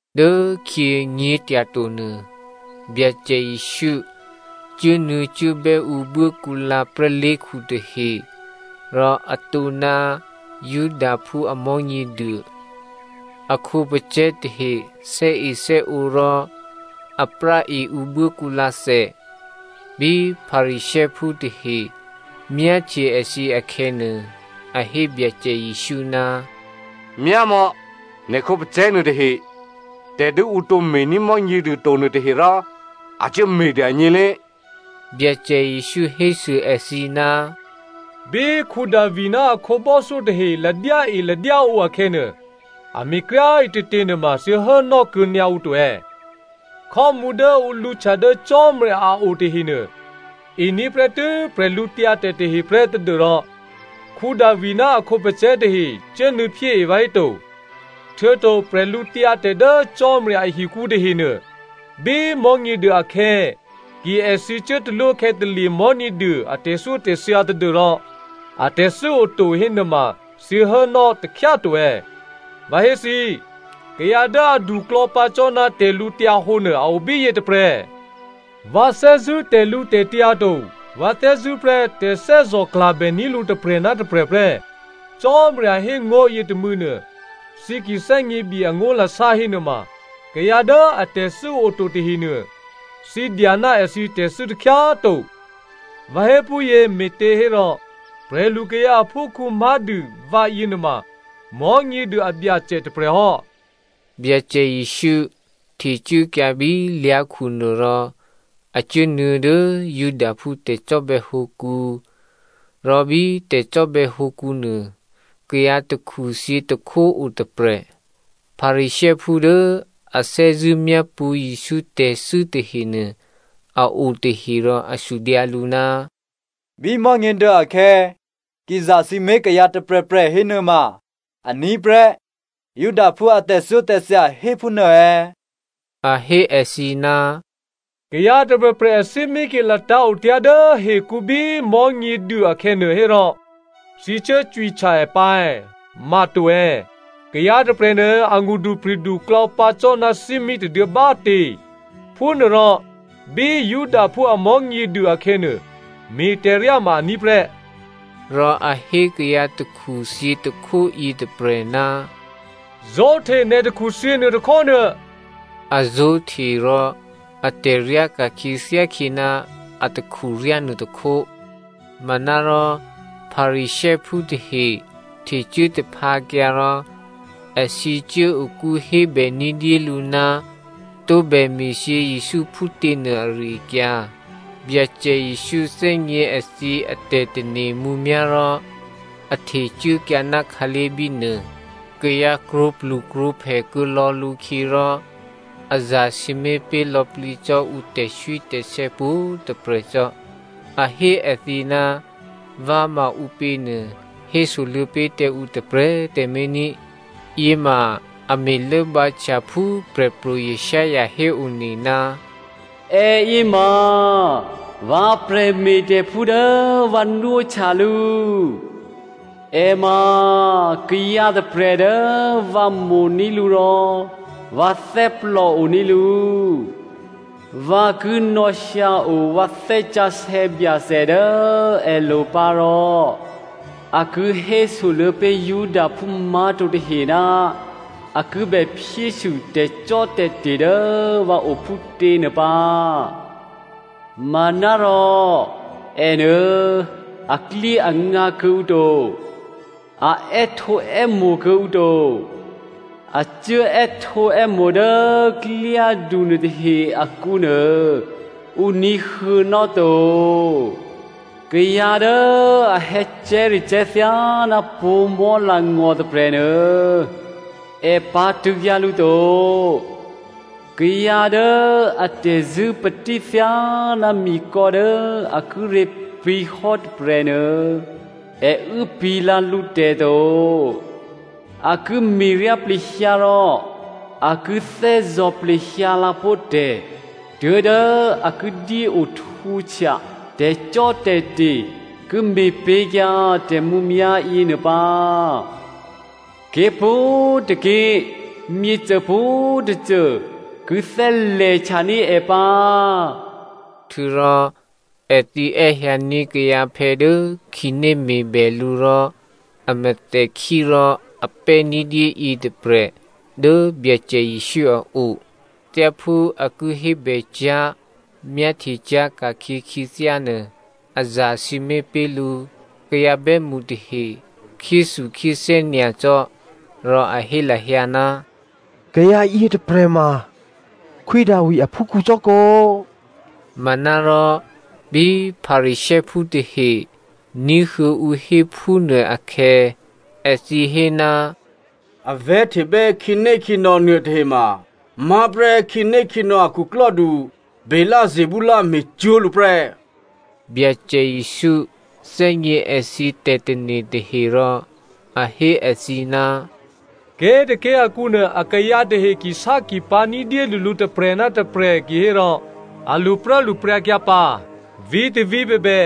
Dốkhyě nyě̤tyatonuô, Byacè Jesǔ cuốnuô̌cuốbè́ ǔ buốkǔlǎ prè́lé̤khu tahe, rò atǒ ná Judaphú a Mò̤́nyěduô. A khǒpacè̤̌ tahe thè́ethè́ǒ rò a práe ǔ buốkǔlǎthè. Bí Pharisěophú tahe myáhtye èthǐ akhè̌nuô, a hé Byacè Jesǔ, “Myámò̌, nè̤ khǒpacè̤̌ nuôtahe, tè̤ dố ǔ tǒ me̤ní̤ Mò̤́nyěduô to nuôtahe rò a cuốme̤ dûgně lé꤮.” Byacè Jesǔ hésû èthǐ, “Bí Davi ná a khǒbò́thyó tahe ladyáeladyáǒ akhè̌nuô, a me̤kryá꤮ ǐtětě nuôma thǐ hốnò́ kuô̌nyǎ ǔ to è̌? Khò́mǔ dố ǔ lǔhtya dố Cò́marya a o tahenuô, ení̤ prè́tû́ bwídu tahe prè́ tadû́rò Davi ná a khǒpacè̤̌ tahe cuốnuô̌phyée vǎhéto? Htuô̌to bwídu dố Cò́marya ahikǔ tahenuô, bí Mò̤́nyěduô akhè̌ ki èthǐ cuốtalwókhè̌talye̤ Mò̤́nyěduô a tè̤thyótè̤thya tadû́rò atè̤thû́ oto hénuôma thǐ hốnò́ takhyá꤮ to è̌? Vǎ hé thǐ, kayǎ dố aduklò̌ pǎ cò́ ná tè̤lǔhǒdu nuô a o bíyě tôprè̤. ‘Vǎ thè́zṳ̂́ tè̤lǔtè̤tyǎ to, vǎ thè́zṳ̂́ prè́ tè̤thè́zò̤klabè ní̤ lǔ tôprè̤ ná tôprè̤ prè́,’ Cò́marya hé ngó̤ yětômû̌nuô, thǐ ki thè́gněbye angó̤lasá hénuôma, kayǎ dố atè̤thû́ oto tahenuô, thǐ dya ná èthǐ tè̤thû́ takhyá꤮ to. Vǎ hé phúyě me̤těhérò, prè̤lukayǎ aphúkhǔ má̤dû vǎ yěnuôma Mò̤́nyěduô a Byacè tôprè̤hò́.” Byacè Jesǔ htecuốkyǎ bí lyá̤khu nuôrò a cuốnuô̌ dố Judaphú tè̤cò́bè̌hǒkǔ. Rò bí tè̤cò́bè̌ hǒkǔ nuô, kayǎ takhuthyě tôkhó o tôprè̤. Pharisěophú dố a thè́zṳ̂́ myápṳ̌ Jesǔ tè̤thû́ tahenuô a o tahe rò a sudyǎ lǔ, “Bí Mò̤́nyěduô akhè̌, ki zasǐmé̤ kayǎ tôprè̤prè̤ hénuôma, aní̤ prè́ Judaphú a tè̤thyótè̤thya hé phúnuô è̌?” A hé èthǐ, “Kayǎ tôprè̤prè̤ athímí ki latǎ̤ otyá̤ dố hekǔ bí Mò̤́nyěduô akhè̌nuô hérò, thǐ cuố cwihtya è pǎ è̌? Ma to è̌? Kayǎ tôprè̤nuô a ngṳdupri̤du klò̌pǎ cò́ ná thímí tôduô̌ bá꤮ tě. Phúnuôrò, bí Judaphú a Mò̤́nyěduô akhè̌nuô, me̤tè̤ryá ma aní̤ prè́.” Rò a hé kayǎ takhuthyě tôkhó yětôprè̤, “Zó̤hte nè̤ takhuthyě nuôtôkhó nuô,” a zó̤hte rò atè̤ ryáka̤khyě thyákhyě ná a takhuryá nuôtôkhó. Manárò Pharisěophú tahe htecuố taphǎkyǎ rò èthǐ cuốokú hébè ní̤dyélǔ ná tǒbè me̤thyě Jesǔ phútěnuô ari-akyǎ. Byacè Jesǔ thè́gně èthǐ atè̤tane̤ mǔmyá̤ rò a htecuốkyǎ ná khǎlé̤ bínuô. Kayǎ krwǒplukrwǒphè kuô̌lò̌ lǔkhyě rò a zasǐmé̤ pé̤ lò̌plǐ cò́ ǔ tè̤swítè̤sè̌ pwǒ̤꤮ tôprè̤ cò́. A hé èthǐ ná vǎ ma ǔpěnuô hésoluô̌ pé̤ tǎ ǔ tôprè̤꤮ tǎmé̤ ní꤮. Yěma a me̤ lốbǎhtya phú Prè̤pro̤ Isaiah héone, “Èyě ma vǎ prè̤me̤tè̤phú dố vǎ nwóhtya lǔ, è ma kayǎ tôprè̤ dố vǎ mo̤ní̤ lǔ rò vǎ thè́plò oní̤ lǔ. Vǎ ki nò̌hyǎo vǎ Thè́ Sǎsè̌ Byacè dố èlo̤ pǎ rò a ki hésoluô̌ pé̤ Judaphú má̤to tahe ná a ki bè phyésû tè̤cò́tè̤te̤ dố vǎ o phútě nuô pǎ. Manárò ènuô aklyéangǎ kuô̌ǔ to. A è́htǒè́mo̤ kuô̌ǔ to. A cuốè́htǒè́mo̤ dố klyádu nuôtahe akǔnuô, ǔ ní̤huô̌nò́ to. Kayǎ dố a hè̌cè̤́recè̤́ thyáná pǒ̤mò̤́ langò̤ tôprè̤nuô, è pǎ̤tṳ̂̌kyǎ lǔ to. Kayǎ dố a tè̤zṳ̂́patí thyáná mikò̌ dố a kíré̤ pǐ̤hò́ tôprè̤nuô è uốpǐ̤ lǎ lǔtè̤ to. A ki me̤ryá plehyǎ rò a ki thè́zò̤ plehyǎ lǎpó̤ tè̤ tuố̤dố a ki dyéohtwǒhtya tè̤cò́tè̤te̤ ki me̤pé̤kyǎ tè̤mǔmyá̤ yěnuô pǎ. Ké̤pwǒ̤tôké̤ myěcô pwǒ̤tôcô ki thè́lè̤htyaní̤ è pǎ.” Htuô̌rò èthǐ è́hyǎní̤ kayǎphè̌ dố khǐné me̤bè lǔ rò a mèthèkhí rò a pè́ ní̤dyé yětôprè̤ dố Byacè Jesǔ a o. Thyáphú a ki hébècyá̤, myáhtye cyá̤ ka̤khyě khyěthyá nuô, a zasǐmé̤ pé̤ lǔ. Kayǎ bè́mṳ tahe khyéthukhyéthè́ nyacò́, rò a hé lahyǎ, “Kayǎ yětôprè̤ ma Khwí Davi aphúkhǔ cò́kǒ?” Manárò bí Pharisěophú tahe ní̤huô̌ ǔ hé phúnuô akhè̌, èthǐ hé, “A vè̤́htebè́ khǐnékhǐnò̌ nuôtahe mamá̤ prè́ khǐnékhǐnò̌ a khuklò́du Beelzebul me̤cwó̤ lǔ prè́.” Byacè Jesǔ thè́gně èthǐ tè̤tane̤ tahe rò a hé èthǐ, “Ké̤tôké̤ akǔnuô akayǎ tahe kisákipǎ̤ ní̤dyédû lǔ tôprè̤ ná tôprè̤ kihérò a lṳpruốlṳpryǎkyǎ pǎ. Vǐ̤tôvǐ̤ bèbè,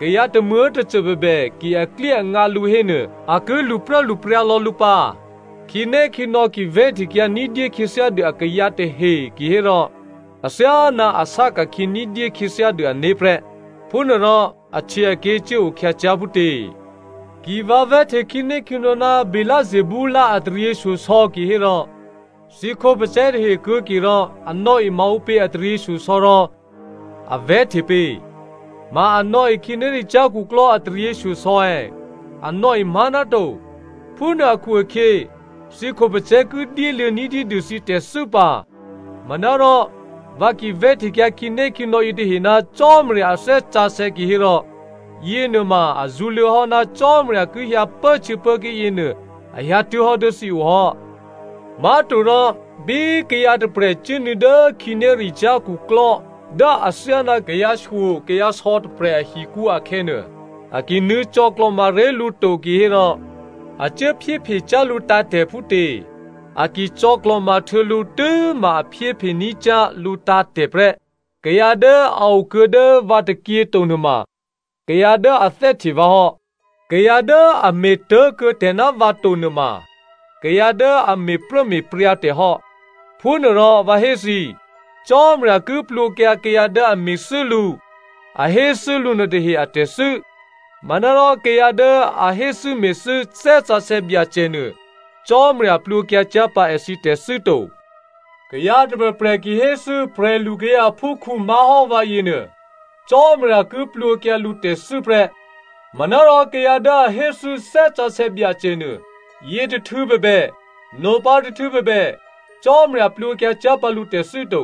kayǎ tômuố̤tôcô bèbè ki aklyéangǎ lǔ hénuô, a ki lṳpruốlṳpryǎ lò̌ lǔ pǎ. Khǐnékhǐnò̌ ki vè̤́htekyǎ ní̤dyé khyěthyádû akayǎ tahe kihérò athyáná a sá ka̤khyě ní̤dyé khyěthyá dû ané̤ prè́. Phúnuôrò ahtyěaké̤ cuốo khyǎ cyá̤ phútě? Ki vǎ vè̤́hte khǐnékhǐnò̌ ná Beelzebul a taryěshyosò̌ kihérò thǐ khǒpacè̤̌ tahe kuô̌ke rò a nò̌e maǔpě a taryěshyosò̌ rò a vè̤́hte pě? Ma a nò̌e khǐnéricyá̤ khuklò́ a taryěshyosò̌ è̌? A nò̌e má̤ náto. Phúnuô akhu-akhyě, thǐ khǒpacè̤̌ ki dyéluô̌ ní̤dyédû thǐ tè̤thû́ pǎ. Manárò vǎ ki vè̤́htekyǎ khǐnékhǐnò̌ yětahe ná Cò́marya a Thè́ Sǎsè̌ kihérò yěnuôma a zṳ̌luô̌hò́ ná Cò́marya ki hyǎ pốhtyěpốké̤ yěnuô a hyǎtuố̤hò́ dố thǐ ohò́. “Má̤torò, bí kayǎ tôprè̤ cuốnuô̌ dố khǐnéricyá̤ khuklò́ dố athyáná kayǎshyokayǎsò̌ tôprè̤ ahikǔ akhè̌nuô, a ki nuô̌ cò̌klò̤ma ré̤ lǔ to kihérò a cuố phyéphe cyá̤ lǔtǎ̤tè̤ phútě? A cò̌klò̤ma htuô̌ lǔ tû́ma a phyéphe ní̤ cyá̤ lǔ tǎ̤tè̤ prè́. “Kayǎ dố a okuô̌ dố vǎ tôkyě to nuôma kayǎ dố a thè́hte vǎ hò́, kayǎ dố a me̤tố̤kuô̌ tè̤ ná vǎ to nuôma kayǎ dố a me̤pruốme̤pryǎ tè̤ hò́. Me̤phúnuôrò vǎ hé thǐ, Cò́marya ki plwǒkyǎ kayǎ dố a me̤thû́ lǔ, a héthû́ lǔ nuôtahe a tè̤thû́. Manárò kayǎ dố a héthû́me̤thû́ Thè́ Sǎsè̌ Byacè nuô Cò́marya plwǒkyǎ cyá̤ pǎ èthǐ tè̤thû́ to. Kayǎ tôprè̤prè̤ ki héthû́ prè̤lukayǎ aphúkhǔ má̤hò́ vǎ yěnuô Cò́marya ki plwǒkyǎ lǔtè̤thû́ prè́. Manárò kayǎ dố a héthû́ Thè́ Sǎsè̌ Byacè nuô, yětôhtû̌ bèbè, nopǎ tôhtû̌ bèbè, Cò́marya plwǒkyǎ cyá̤ pǎ lǔtè̤thû́ to.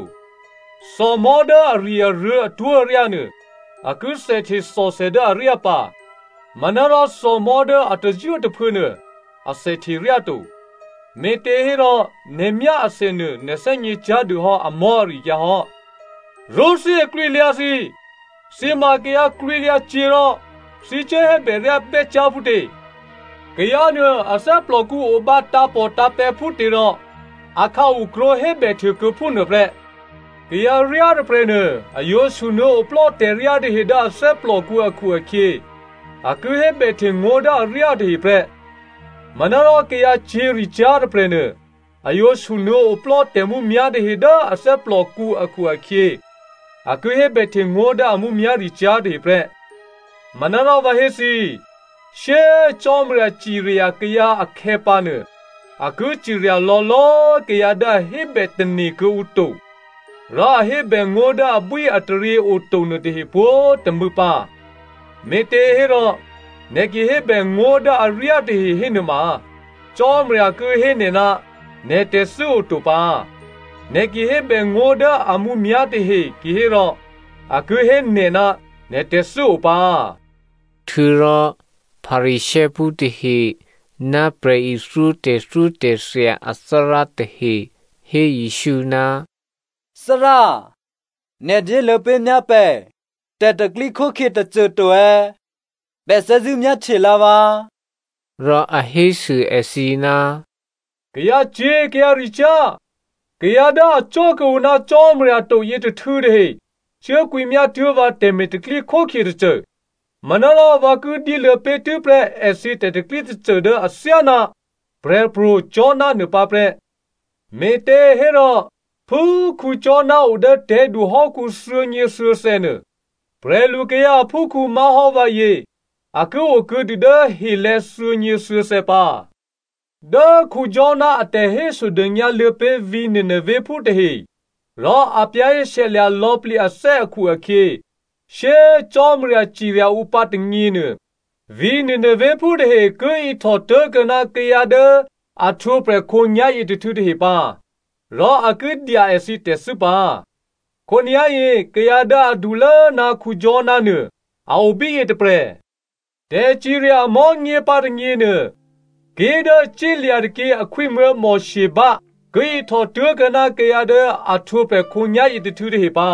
“Thòmò̤́ dố ari̤-aruô̤̌ atwó̤aryá nuô, a ki thèhte thòthè dố aryá pǎ. Manárò thòmò̤́ dố a tazwítaphuô̌ nuô, athèhte ryá to. Me̤těhérò nè̤ myá athè nuô, nè̤ thè́gně cyá̤ dû hò́ amò̤́ ari-akyǎ hò́. Rṳ́thí aklwǐalyǎ thǐ꤮, thǐ ma kayǎ klwǐlyǎ cyě̤ rò thǐ cuố hébè ryá bè́cyá̤ phútě? Kayǎ nuô a thè́plòkǔ obǎ tǎ̤pòtǎ̤pè̤̌ phútěrò akhǎu krwǒ hébèhte kuô̌ phúnuôprè́. Kayǎ ryá tôprè̤nuô, a yǒ sunuô̌ oplò́ tè̤ryá tahe dố a thè́plòkǔ akhu-akhyě, a ki hébèhte ngó̤ dố aryá tahe prè́. Manárò kayǎcyě̤ricyá̤ tôprè̤nuô, a yǒ sunuô̌ oplò́ tè̤mǔmyá̤ tahe dố a thè́plòkǔ akhu-akhyě, a ki hébèhte ngó̤ dố a mǔmyá̤ricyá̤ tahe prè́. Manárò vǎ hé thǐ, shyé꤮ Cò́marya cirya kayǎ akhè̌pǎnuô, a ki cirya lò̌lò̌꤮ kayǎ dố a hébè tane̤ kuô̌ǔ to rò a hébè ngó̤ dố abwíataryě oto nuôtahe pwǒ̤꤮ tômû̌ pǎ. Me̤těhérò, nè̤ ki hébè ngó̤ dố aryá tahe hénuôma, Cò́marya ki hé nè̤ ná nè̤ tè̤thû́ oto pǎ. Nè̤ ki hébè ngó̤ dố a mǔmyá̤ tahe kihérò, a ki hé nè̤ ná nè̤ tè̤thû́ o pǎ.” Htuô̌rò Pharisěophú tahe ná prè̤ithyó tè̤thyótè̤thya athárá tahe hé Jesǔ, “Thárá, nè̤ dyéluô̌ pé̤ myá pè̤ tè̤pro̤tè̤prya̤ tôcô to, pè̤ thè́zṳ̂́ myáhtye lǎ vǎ.” Rò a hésû èthǐ, “Kayǎcyě̤ kayǎricyá̤, kayǎ dố acò́ kuô̌ǔ ná Cò́marya to yětôhtû̌ tahe cuốkwǐmyá tuố̤ vǎ tè̤me̤ tè̤pro̤tè̤prya̤ tôcô, manárò vǎ ki dyéluô̌ pé̤tû́prè́ èthǐ tè̤pro̤tè̤prya̤ tôcô dố athyáná Prè̤pro̤ Jona nuô pǎ prè́. Me̤těhérò, phú Jona o dố tè̤̌du hò́kǔ thuô̌nyěthuô̌thè̌ nuô, prè̤lukayǎ aphúkhǔ má̤hò́ vǎyě a ki okuô̌dû dố helè̤̌ thuô̌nyěthuô̌thè̌ pǎ. Dố Jona a tè̤hésodônyǎ luô̌ pé̤ vǐ̤ Ninevephú tahe rò a za̤ ní̤dû lò̌plǐ hò́ ané̤ akhu-akhyě, shyé꤮ Cò́marya cirya ǔ pǎ tônyěnuô, vǐ̤ Ninevephú tahe ki ihtò tố̤kuô̌ ná kayǎ dố a htwǒprè̤ khǒnyá̤ yětôhtû̌ tahe pǎ rò a ki dya èthǐ tè̤thû́ pǎ. Khǒnyá̤yě kayǎ dố adulố ná Jona nuô a o bíyě tôprè̤. Tè̤cirya amò̤́nyě pǎ tônyěnuô, ké̤ dố cílya̤ tôkyě akhwímuố̤ Sheba ki ihtò tố̤kuô̌ ná kayǎ dố a htwǒprè̤ khǒnyá̤yě tôhtû̌ tahe pǎ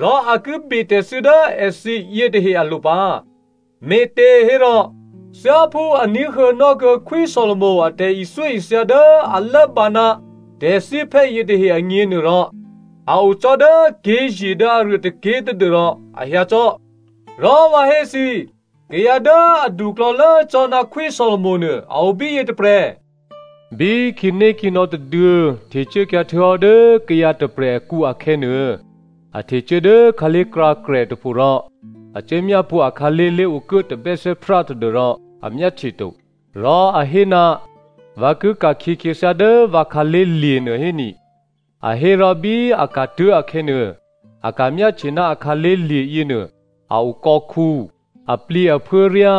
rò a ki betè̤thû́ dố èthǐ yětahe alo̤ pǎ, me̤těhérò thyáphú a ní̤huô̌nò́ kuô̌ Khwí Solomo a tè̤ithyóithya dố a lốbǎ ná tè̤thíphè́ yětahe agněnuôrò, a o cò́ dố ké̤ye̤ dố aruô tôké̤ tadû́rò a hyǎ cò́. Rò vǎ hé thǐ, kayǎ dố aduklò̌lố cò́ ná Khwí Solomo nuô a o bíyě tôprè̤. “Bí khǐnékhǐnò̌ tôduô̌ htecuốkyǎ htuô̌hò́ dố kayǎ tôprè̤ akǔ akhè̌nuô, a htecuố dố khǎlé̤krǎkrè tôpho rò a cuố myápṳ̌ akhǎlé̤ lé̤okuố tabè́thè́prá tadû́rò a myáhtye to. Rò a hé, ‘Vǎ ki ka̤khyě khyěthyá dố vǎ khǎlé̤ lye̤nuô héni,’ a hé rò bí a ka̤tuố̤ akhè̌nuô, a ka̤myáhtye ná akhǎlé̤ lye̤ yěnuô a o kò̌khǔ, aplǐaphuốryá,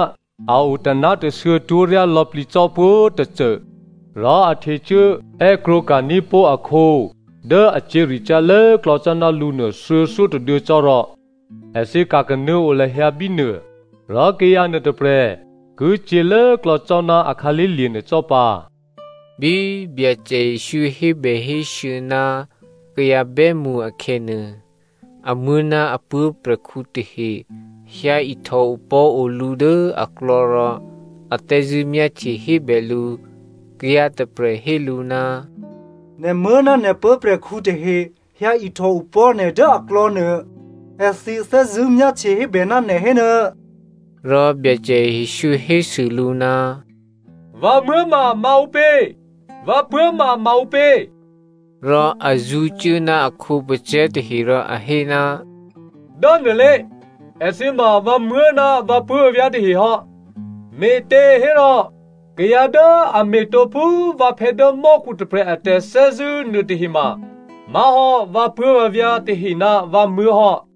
a o taná̤tashuô̌ twó̤ryá lò̌plǐ cò́ pwǒ̤꤮ tôcô. Rò a htecuố è́krwǒka̤ní̤ pó̤ akhǒ dố a cyě̤ricyá̤ lốklò̌ cò́ ná lǔnuô thuô̌thyótôduô̌ cò́ rò èthǐ ka̤kanuô̌ o lahyǎ bínuô. Rò kayǎ nuôtôprè̤ ki cyě̤ lốklò̌ cò́ ná a khǎlé̤lye̤ nuô cò́ pǎ.” Bí Byacè Jesǔ hébèhésû̌ ná kayǎ bè́mṳ akhè̌nuô, amuố̤ ná a puố̤prè̤khǔ tahe hyǎ ihtò opò̤́ o lǔ dố aklò̌ rò a thè́zṳ̂́ myáhtye hébè lǔ. Kayǎ tôprè̤ hé lǔ, “Nè̤muố̤ ná nè̤ puố̤prè̤khǔ tahe hyǎihtò opò̤́ nè̤ dố aklò̌nuô. Èthǐ thè́zṳ̂́ myáhtye hébè ná nè̤ hénuô.” Rò Byacè Jesǔ hésû lǔ, “Vǎmuố̤ ma maǔpě? Vǎ puố̤ ma maǔpě?” Rò a zṳ̌cuố ná a khǒpacè̤̌ tahe rò a hé, “Dốnuôlé, èthǐ ma vǎmuố̤ ná vǎpuố̤vǎvyá̤ tahe hò́. Me̤těhérò kayǎ dố a me̤tǒ phú vǎphè̌ dố mò́khu tôprè̤ a tè̤thè́zṳ̂́ nuôtahe ma má̤hò́ vǎpuố̤vǎvyá̤ tahe ná vǎmuố̤ hò́.”